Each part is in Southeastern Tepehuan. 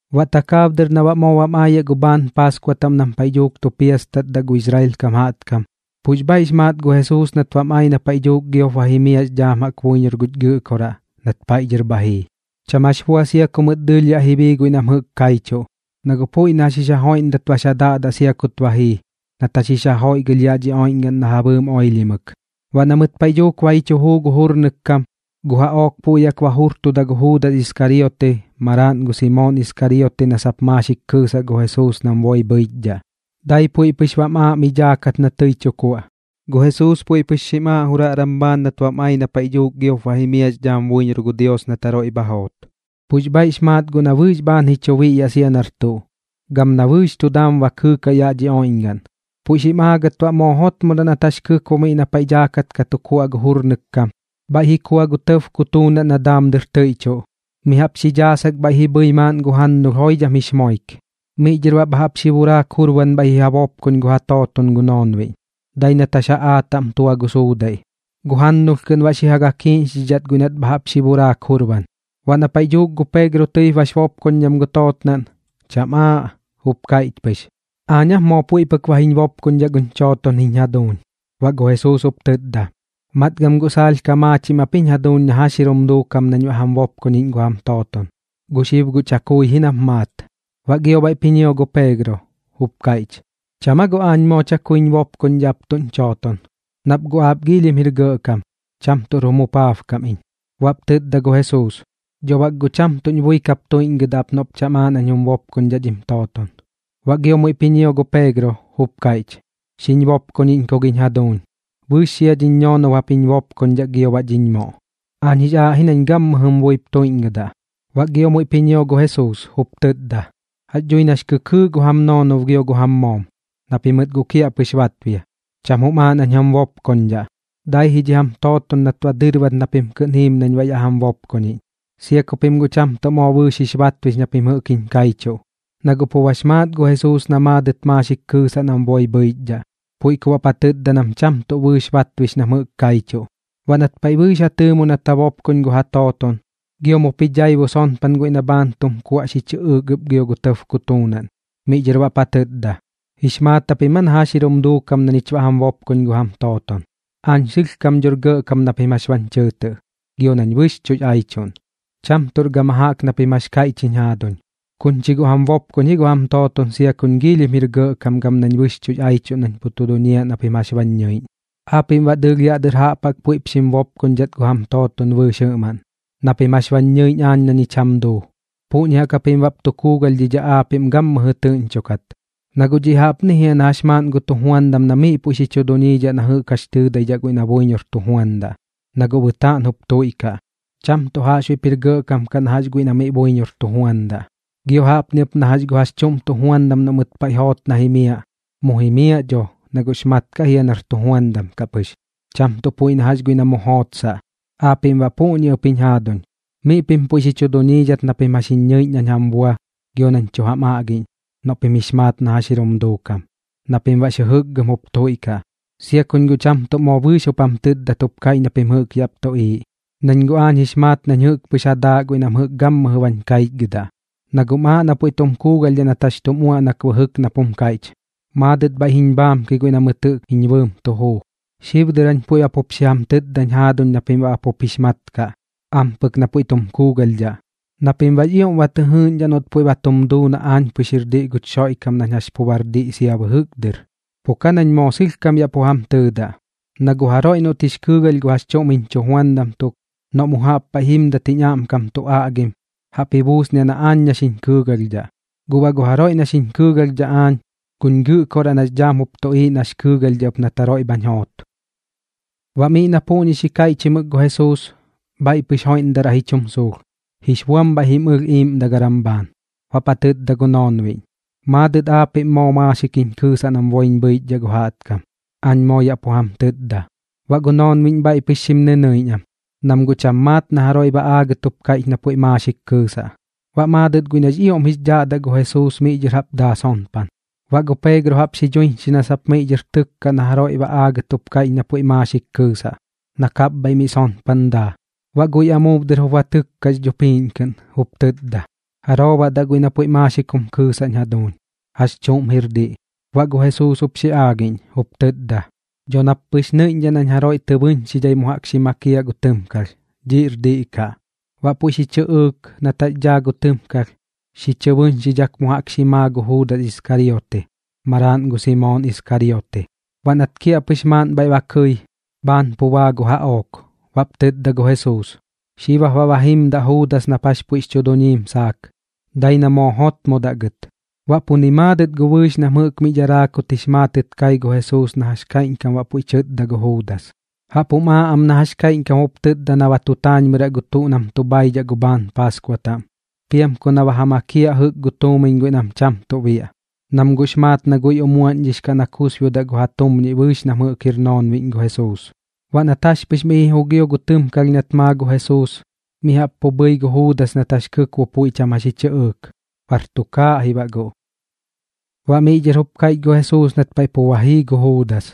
Baꞌ takaab dɨr na baꞌ moo bam aayaꞌ gu bhaan Paaskua taꞌm nam paiꞌ dhuuk tu piastatdaꞌ gu Israel kam jaꞌtkam, pux bhaiꞌ bax maat gu Jesuus nat bam ai na paiꞌ dhuuk giop ba jimiaꞌx dhaam buiñor guch Gɨꞌkoraꞌ nat paiꞌ dhɨr bha jii. Cham jax bua sia ku mɨt dɨɨlh yaꞌ ji bii guiꞌ nam jɨꞌk kaichuꞌ, na guꞌ puiꞌ na jax jix ja joiꞌndat bax ja daꞌdaꞌ sia kut ba jii nat jax jix ja joiꞌgɨlh yaꞌ dhi oiꞌñgaꞌn na ja bɨɨm oilhimɨk. Baꞌ na mɨt paiꞌ dhuuk ba ji chu juu gu jurnɨk kam, gu jaꞌook puiꞌ jaꞌk ba jurtuda gu Juudas Iskariote maraaꞌn gu Simoon Iskariote na sap maaxik kɨɨsaꞌ gu Jesuus nam boi bhɨichdhaꞌ, dai puiꞌ pɨx bam aaꞌ miꞌ dhaakat na tɨi tu kuaꞌ. Gu Jesuus puiꞌ pɨx xim aaꞌ juraꞌram bhaan nat bam ai na paiꞌ dhuuk giop ba jimiaꞌx dhaam buiñor gu Dios nat jaroiꞌ bha joot. Pux bhaiꞌx maat guꞌ na bɨɨx bhaan ji chu biꞌyaꞌ sia nar tuꞌ, gam na bɨɨx tu daam ba kɨɨkaꞌ yaꞌ dhi oiꞌñgaꞌn. Puiꞌ xim aagat baꞌ moo jotmodaꞌ nat jax kɨkbo miꞌ na paiꞌ daakat ka tu kuaꞌ gu jurnɨk kam, bhaiꞌ ji kua gu tɇb kutuunaꞌn na daam dɨr tɨiꞌchuꞌ, mi jaꞌp xi dhaasak bhaiꞌ ji bhɨi maaꞌn gu jannulh joidham jix moik. Miꞌ dhɨr baꞌ bha jaꞌp xi buraak jurban bhaiꞌ ji ja bopkoñ gu ja tooton gu noonbiꞌñ, dai nat jax jaꞌaa taꞌm tua gu suudaiꞌ, gu jannulh kɨꞌn baꞌ xi ja gakiiꞌñxidhidhat guiꞌ nat bha jaꞌp xi buraak jurban. Baꞌ na paiꞌ dhuuk gu Peegro tɨip bax bopkoñdham gu tootnaꞌn, cham aaꞌ, jup kaiꞌch pɨx: ―¿Aañ aap moo puiꞌ pɨk ba jiñ bopkoñdhaꞌ guñ chooton jiñ jaduuñ? Baꞌ gu Jesuus jup tɨtda: ―Matgam guꞌ saalh ka maachim ap jiñ jaduuñ na jax jir jum duukam nañ baꞌ jam bopkoñiꞌñ gu jam tooton. Gu xib guꞌ chakui ji nap maat. Baꞌ gio bhaiꞌp ji ñio gu Peegro, jup kaiꞌch: ―¿Cham aa guꞌ aañ moo chakuiñ bopkoñdhaꞌ ap tuꞌñ chooton? Nap guꞌ aap giilhim jir gɇꞌkam, cham tuꞌr jum jupaabkam iñ. Baꞌp tɨtda gu Jesuus: ―Dho bak guꞌ cham tuꞌñ bui kap tuiꞌñgɨdaꞌ ap noꞌp cham aaꞌ nañ jum bopkoñdhaꞌ dhim tooton. Baꞌ gio muiꞌp ji ñio gu Peegro, jup kaiꞌch: ―Xiñ bopkoñiꞌñ ku giñ jaduuñ. Bɨɨx xia dhiñ ñoonob jap jiñ bopkoñdhaꞌ gio baꞌ dhiñ moꞌ. Aañ jix aaꞌ ji nañ gammɨjɨm buip tuiꞌñgɨdaꞌ. Baꞌ gio muiꞌp ji ñio gu Jesuus, jup tɨtda: ―Jax dhui nax kɨkɨɨꞌ gu jam noonob gio gu jam moom, na pimɨt guꞌ kiaꞌpɨx batbia. Cham jum aaꞌ nañ jam bopkoñdhaꞌ, dai ji dhi jam tooton nat ba dɨrbat na pim kɨꞌn jiim nañ baꞌ yaꞌ jam bopkoñiꞌñ, sia ku pim cham tuꞌ moo bɨɨx jix batbix na pim jɨꞌk jiñ kaichuꞌ. Na guꞌ pu bax maat gu Jesuus na maadɨt maaxik kɨɨsaꞌ nam boi bhɨichdhaꞌ. Puiꞌ ku baꞌp ja tɨtda nam cham tuꞌ bɨɨx batbix nam jɨꞌk kaichuꞌ. Baꞌ nat paiꞌ bɨɨx ja tɨɨmo nat ja bopkoñ gu ja tooton, gio mup ji dhaibu sonpan guiꞌ na bhaan tum kuaꞌ xi chɨꞌɨɨk ɨp gio gu tɇb kutuunaꞌn. Miꞌ dhɨr baꞌp ja tɨtda: ―¿Jix maat japim aa na jax jir jum duukam na ñich baꞌ jam bopkoñ gu jam tooton? Aañ sɨlhkam dhor gɇꞌkam na pim jax bañ chɨɨtɨꞌ, gio nañ bɨxchuꞌx aichuꞌn. Cham tuꞌr gama jaꞌk na pim jax kaiꞌch jiñ jaaduñ. Kuñ chi guꞌ jam bopkoñ ji gu jam tooton sia kuñ giilhim jir gɇꞌkam gam nañ bɨxchuꞌx aichuꞌn nañ pu tu duñiaꞌ na pim jax bañ ñɨiꞌñ. Aapiꞌm baꞌ dɨɨlh yaꞌ dɨr jaꞌp jaꞌk puiꞌp xim bopkoñdhat gu jam tooton bɨɨx jɨꞌmaꞌn. Na pim jax bañ ñɨiꞌñ aañ na ñich jam duu, puꞌñi jaꞌk japim baꞌp tu kuugalhdhidhaꞌ aapiꞌm gammɨjɨ tɨꞌñchokat. Na guꞌ dhiꞌ jaꞌpni jia na jax maaꞌn gu tujuandam na miꞌ puiꞌ xi chu duñiidhaꞌ na jɨꞌk jax tɨɨdaidhaꞌ guiꞌ na buiñor tu juandaꞌ, na guꞌ bɨtaꞌn jup tuiꞌkaꞌ, cham tuꞌ jaꞌxbuiꞌp jir gɇꞌkam kaꞌ guꞌ na jax guiꞌ na miꞌ buiñor tu juandaꞌ. Gio baꞌ jaꞌpni ɨp na jax gu jax chuꞌm tujuandam noꞌ mɨt paiꞌ joot na jimiaꞌ, mu jimiaꞌ dho na guꞌx mat kaꞌ jia nar tujuandam kaꞌ pɨx, cham tuꞌ puiꞌ na jax guiꞌ na mu jootsaꞌ. Aapiꞌm baꞌ puꞌñi ɨp jiñ jaaduñ. Miꞌ pim puiꞌ xi chu duñiidhat na pim jax jiñ ñɨiꞌñ nañ jam bua gio nañ tu jam aꞌgiꞌñ noꞌ pim jix maat na jax jir jum duukam, na pim baꞌx jɨjɨkgɨm jup tuiꞌkaꞌ. ’Sia kuñ guꞌ cham tuꞌ moo bɨɨx jup jam tɨtdat jup kaiꞌch na pim jɨꞌk yaꞌp tuꞌiiꞌ, nañ guꞌ aañ jix maat nañ jɨꞌk pɨx ja daaꞌ guiꞌ nam gammɨjɨ bañ kaichgɨdaꞌ. Na guꞌm aaꞌ na puiꞌ tum kuugalhdhaꞌ nat jax tum uaꞌnak bɨjɨk nap jum kaiꞌch: “Maadɨt bhaiꞌ jiñ bhaamki guiꞌ na mɨt jɨꞌk jiñ bɨɨm tu juu.” Xib dɨr jañ puiꞌ ba pup xi jam tɨtdañ jaaduñ na pim baꞌ ba pup jix mat kaꞌ, ampɨk na puiꞌ tum kuugalhdhaꞌ, na pim baꞌx ioꞌm ba tɨ jɨɨgiꞌñdhaꞌ noꞌt puiꞌ ba tum duu na aañ pɨx jir diꞌ guch Xoiꞌkam nañ jax pu bar diꞌ sia bɨjɨk dɨr. Pu ka nañ moo sɨlhkam yaꞌ pu jam tɨɨdaꞌ, na gu jaroiꞌ noꞌt jix kɨɨgalh gu jax chuꞌm jiñ chujuandam tuk, noꞌ mu jaꞌp paiꞌ jimdat jiñ aꞌmkam tu aꞌgim, jaꞌp ji buusniaꞌ na aañ na xiñ kɨɨgalhdhaꞌ. Guꞌ baꞌ gu jaroiꞌ na xiñ kɨɨgalhdhaꞌ aañ, guñ Gɨꞌkoraꞌ nax dhaam jup tuꞌiiꞌ nax kɨɨgalhdhaꞌ ɨp nat jaroiꞌ bhañ joot. Baꞌ miꞌ na puꞌñi xi kaiꞌchimɨk gu Jesuus, bhaiꞌ pɨx joiꞌndaraꞌ ji chum suulh, jix buam bhaiꞌ jim ɨlh iiꞌmdagaram bhaan. Baꞌp ja tɨtda gu noonbiꞌñ: ―Maadɨt aapiꞌm moo maaxik jiñ kɨɨsaꞌ nam boiñ bhɨichdhaꞌ gu jaꞌtkam. Aañ moo yaꞌ pu jam tɨtda. Baꞌ gu noonbiꞌñ bhaiꞌ pɨx xim nɨnɨiꞌñ am, nam guꞌ cham maat na jaroiꞌ baꞌ aagat jup kaiꞌch na puiꞌ maaxik kɨɨsaꞌ. Baꞌ maadɨt guiꞌ nax ioꞌm jix dhaꞌdaꞌ gu Jesuus miꞌ dhɨr jaꞌp daa sonpan. Baꞌ gu Peegro jaꞌp xi dhuiñxi na sap miꞌ dhɨr tɨkkaꞌ na jaroiꞌ baꞌ aagat jup kaiꞌch na puiꞌ maaxik kɨɨsaꞌ, na kapbhaiꞌ mi sonpan daa. Baꞌ guiꞌ amuub dɨr jup ba tɨkkax dhupiiꞌñ kɨꞌn, jup tɨtda: ―¿Jaroo baꞌ daꞌ guiꞌ na puiꞌ maaxik jum kɨɨsaꞌñ jaduuñ? ¿Jax chuꞌm jir diꞌ? Baꞌ gu Jesuus jup xi aagiꞌñ, jup tɨtda: ―Dho nap pɨx nɨiꞌñdhaꞌ nañ jaroiꞌ tɨ bɨꞌñxidhai mu jaꞌk xi makiaꞌ gu tɨmkalh. Dhiꞌr diꞌ kaꞌ. Baꞌ puiꞌ xi chɨꞌɨɨk, nat jax daa gu tɨmkalh, xi chɨ bɨꞌñxidhak mu jaꞌk xi maa gu Juudas Iskariote, maraaꞌn gu Simoon Iskariote. Baꞌ nat kiaꞌpɨx maaꞌn bhaiꞌ ba kɨi, bhaan pu baa gu jaꞌook. Baꞌp tɨtda gu Jesuus: ―Xib jap baꞌ ba jimdaꞌ Juudas nap jax puiꞌx chu duñiim saak, dai na moo jotmodaꞌ gɨt. Baꞌ pu ni maadɨt gu bɨɨx nam jɨꞌk mi dharaa kut jix maatɨt kai gu Jesuus na jax kaiꞌñkam puiꞌ tɨtda gu Juudas. Jaꞌp jum aaꞌ am na jax kaiꞌñkam jup tɨtda na ba tu taañmɨraꞌ gu tuꞌ nam tu bhaidhaꞌ gu bhaan paaskua taꞌm, piam ku na ba ja makiaꞌ jɨꞌk gu tuumiñ guiꞌ nam cham tuꞌ biaꞌ, nam guꞌx maat na guiꞌ umuaꞌñdhix na kusbiodaꞌ gu ja tumñiꞌ bɨɨx nam jɨꞌk jir noonbiꞌñ gu Jesuus. Baꞌ nat jax pɨx miꞌ ji jugio gu tɨmkalh nat maa gu Jesuus, mi jaꞌp pu bhɨi gu Juudas nat jax kɨkbo puiꞌ cham jax ji chɨꞌɨɨk. Bar tukaaꞌ ji baꞌ guꞌ. Baꞌ miꞌ dhɨr jup kaiꞌch gu Jesuus nat paiꞌ pu ba jii gu Juudas: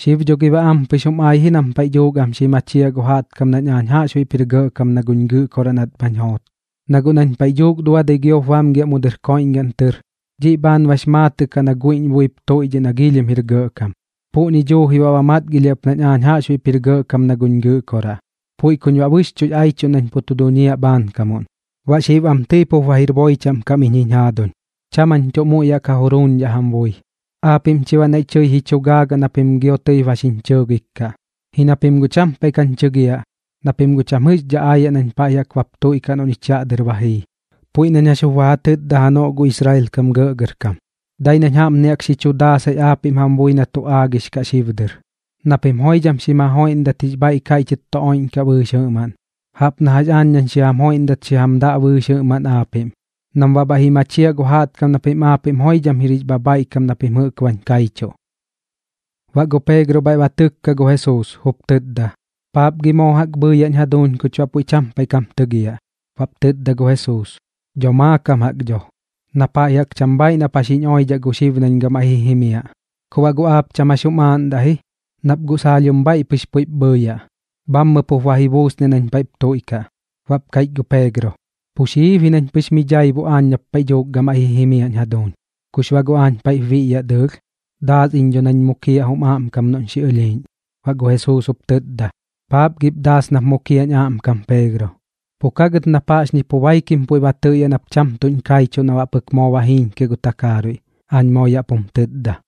―Xib dho gi baꞌ ampɨx jum ai ji nam paiꞌ dhuuk am xi machiaꞌ gu jaꞌtkam nañ aañ jaꞌxbuiꞌp jir gɇꞌkam na guñ Gɨꞌkoraꞌ nat bhañ joot. Na guꞌ nañ paiꞌ dhuuk duadɨi giop bamgiaꞌ mu dɨr koiꞌñgaꞌn tɨr, dhiꞌ bhaan bax maatɨꞌ kaꞌ na guiꞌñ buip tuiꞌdhiꞌ na giilhim jir gɇꞌkam. Puꞌñi duuji baꞌ ba matgilhiaꞌ ɨp nañ aañ jaꞌxbuiꞌp jir gɇꞌkam na guñ Gɨꞌkoraꞌ, puiꞌ kuñ baꞌ bɨxchuꞌx aichuꞌn nañ pu tu duñiaꞌ bhaankamuꞌn. Baꞌ xib am tɨi pup ba jir boi chaꞌm kam iñ jiñ jaaduñ, cham jañ tuꞌ muiꞌ yaꞌ ka juruuñdhaꞌ jam bui. Aapiꞌm chi baꞌ naiꞌ tɨi ji chu gaagaꞌ na pim gio tɨi ba xiñ chɨɨgik kaꞌ, ji na pim guꞌ cham paiꞌ kañ chɨgiaꞌ, na pim guꞌ cham jɨꞌxdhaꞌ aayaꞌ nañ paiꞌ jaꞌk bap tuiꞌkaꞌ noꞌ ñich yaꞌ dɨr ba jii, puiꞌ nañ jax jup ba ja tɨtda janoꞌ gu Israel kam gɇꞌgɇrkam. Dai nañ jaꞌpni jaꞌk xi chu daasai aapiꞌm jam bui na tu aagix kaꞌ xib dɨr, na pim joidham xim ja joiꞌndat jix bhaiꞌ kaiꞌchɨt tu oiꞌñkaꞌ bɨɨx jɨꞌmaꞌn, jaꞌp na jax aañ nañ xi jam joiꞌndat xi jam daꞌ bɨɨx jɨꞌmaꞌn aapiꞌm, nam baꞌ bhaiꞌ ji machiaꞌ gu jaꞌtkam na pim aapiꞌm joidham jir jix bhabhaiꞌkam na pim jɨꞌk bañ kaichuꞌ. Baꞌ gu Peegro bhaiꞌ ba tɨkka gu Jesuus, jup tɨtda: ―¿Paap gi moo jaꞌk bhɨɨyaꞌñ jaduuñ kuch baꞌ puiꞌ cham paiꞌ kam tɨgiaꞌ? Baꞌp tɨtda gu Jesuus: ―Dho maakam jaꞌk dho, na paiꞌ jaꞌk cham bhaaiꞌ nap jax jiñ oidhaꞌ gu xib nañ gamaiꞌ ji jimiaꞌ. Ku baꞌ guꞌ aap cham jax jum aaꞌndaꞌ ji, nap guꞌ saalhim bhaiꞌ pɨx puiꞌp bhɨɨyaꞌ, bhammɨp jup ba ji buusniaꞌ nañ paiꞌp tuiꞌkaꞌ. Baꞌp kaiꞌch gu Peegro: ―Pu xiib ji nañ pɨx mi dhaibu aañ nap paiꞌ dhuuk gamaiꞌ ji jimiaꞌñ jaduuñ. ¿Kux baꞌ guꞌ aañ paiꞌp biꞌyaꞌ dɨɨlh? Daas iñ dho nañ mukiaꞌ jum aꞌmkam noꞌñ xi ɨlhiiꞌñ. Baꞌ gu Jesuus jup tɨtda: ―¿Paap gip daas nap mukiaꞌñ aꞌmkam Peegro? Pu ka gɨt nap jaꞌxñi pu baikim puiꞌ ba tɨꞌyaꞌ nap cham tuꞌñ kaichuꞌ na baꞌ pɨk moo ba jiiñkiaꞌ gu takaaruiꞌ, aañ moo yaꞌ pum tɨtda.